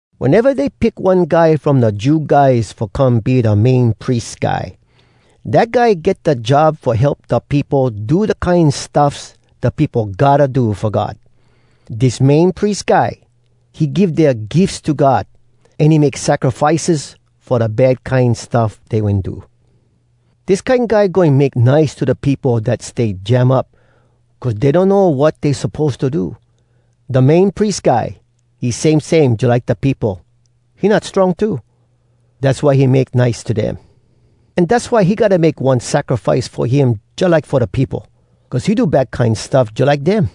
Weneva dey pick one guy from da Jew guys fo come be da Main Pries Guy, dat guy get da job fo help da peopo do da kine stuffs da peopo gotta do fo God. Dis Main Pries Guy, he give dea gifs to God, an he make sacrifices fo da bad kine stuff dey wen do. Dis kine guy goin make nice to da peopo dat stay jam up cuz dey donno wat dey suppose to do. Da Main Pries Guy, he same same jalike da peopo, he not strong too. Dass why he make nice to dem. An dass why he gotta make one sacrifice fo him jalike fo da peopo, cuz he do bad kine stuff jalike dem.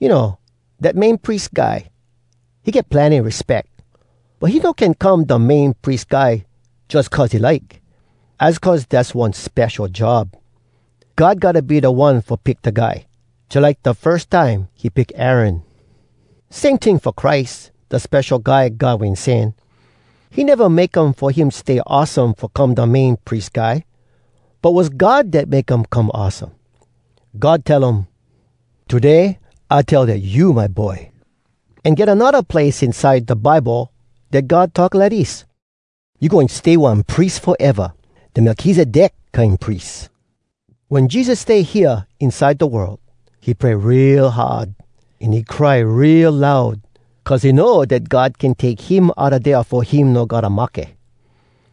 You know, dat Main Pries Guy, he get plenny respeck. But he no can come da Main Pries Guy jus cuz he like. Az cuz dass one spesho job. God gotta be da One fo pick da guy, jalike da firs time he pick Aaron. Same ting fo Christ, da Spesho Guy God Wen Sen. He neva make um fo him stay awesome fo come da Main Pries Guy. But was God dat make um come awesome. God tell um, “Today I tell Dat you my Boy!” An get anodda place inside da Bible dat God talk lidis: “You goin stay one pries foeva, Da Melkizedek kine pries.” Wen Jesus stay hea inside da world, he pray real hard, an he cry real loud, cuz he know dat God can take him outa dea fo him no gotta mahke.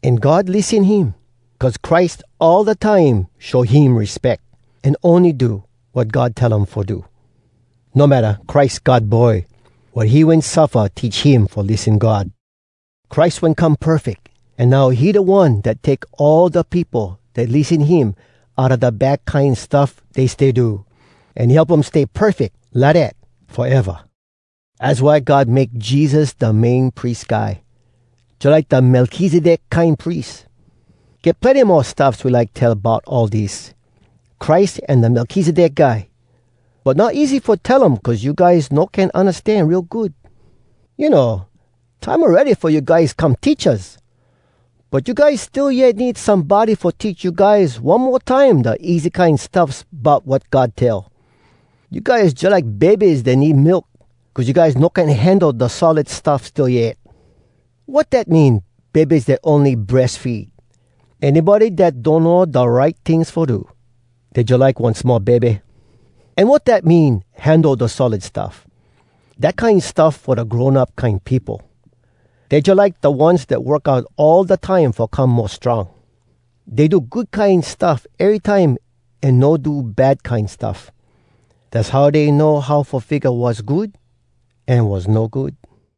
An God lissen him, cuz Christ all da time show him respeck, an ony do wat God tell um fo do. No matta Christ God Boy, wat he wen suffa teach him fo lissen God. Christ wen come perfeck, an now he da One dat take all da peopo dat lissen him outa da bad kine stuff dey stay do. An he help um stay perfeck lidat foeva. Az why God make Jesus da Main Pries Guy, jalike da Melkizedek kine pries. Get plenny mo stuffs we like tell bout all dis, Christ an da Melkizedek guy. But not easy fo tell um cuz you guys no can undastan real good. You know, time awready fo you guys come teachas. But you guys still yet need somebody fo teach you guys one mo time da easy kine stuffs bout wat God tell. You guys jalike bebes dat need milk, cuz you guys no can handle da solid stuff still yet. Wat dat mean, “bebes dat ony breas feed”? Anybody dat donno da right tings fo do, dey jalike one small bebe. An wat dat mean, “handle da solid stuff”? Dat kine stuff fo da grown up kine peopo. Dey jalike da ones dat work out all da time fo come mo strong. Dey do good kine stuff erytime an no do bad kine stuff. Dass how dey know how fo figga wass good an wass no good.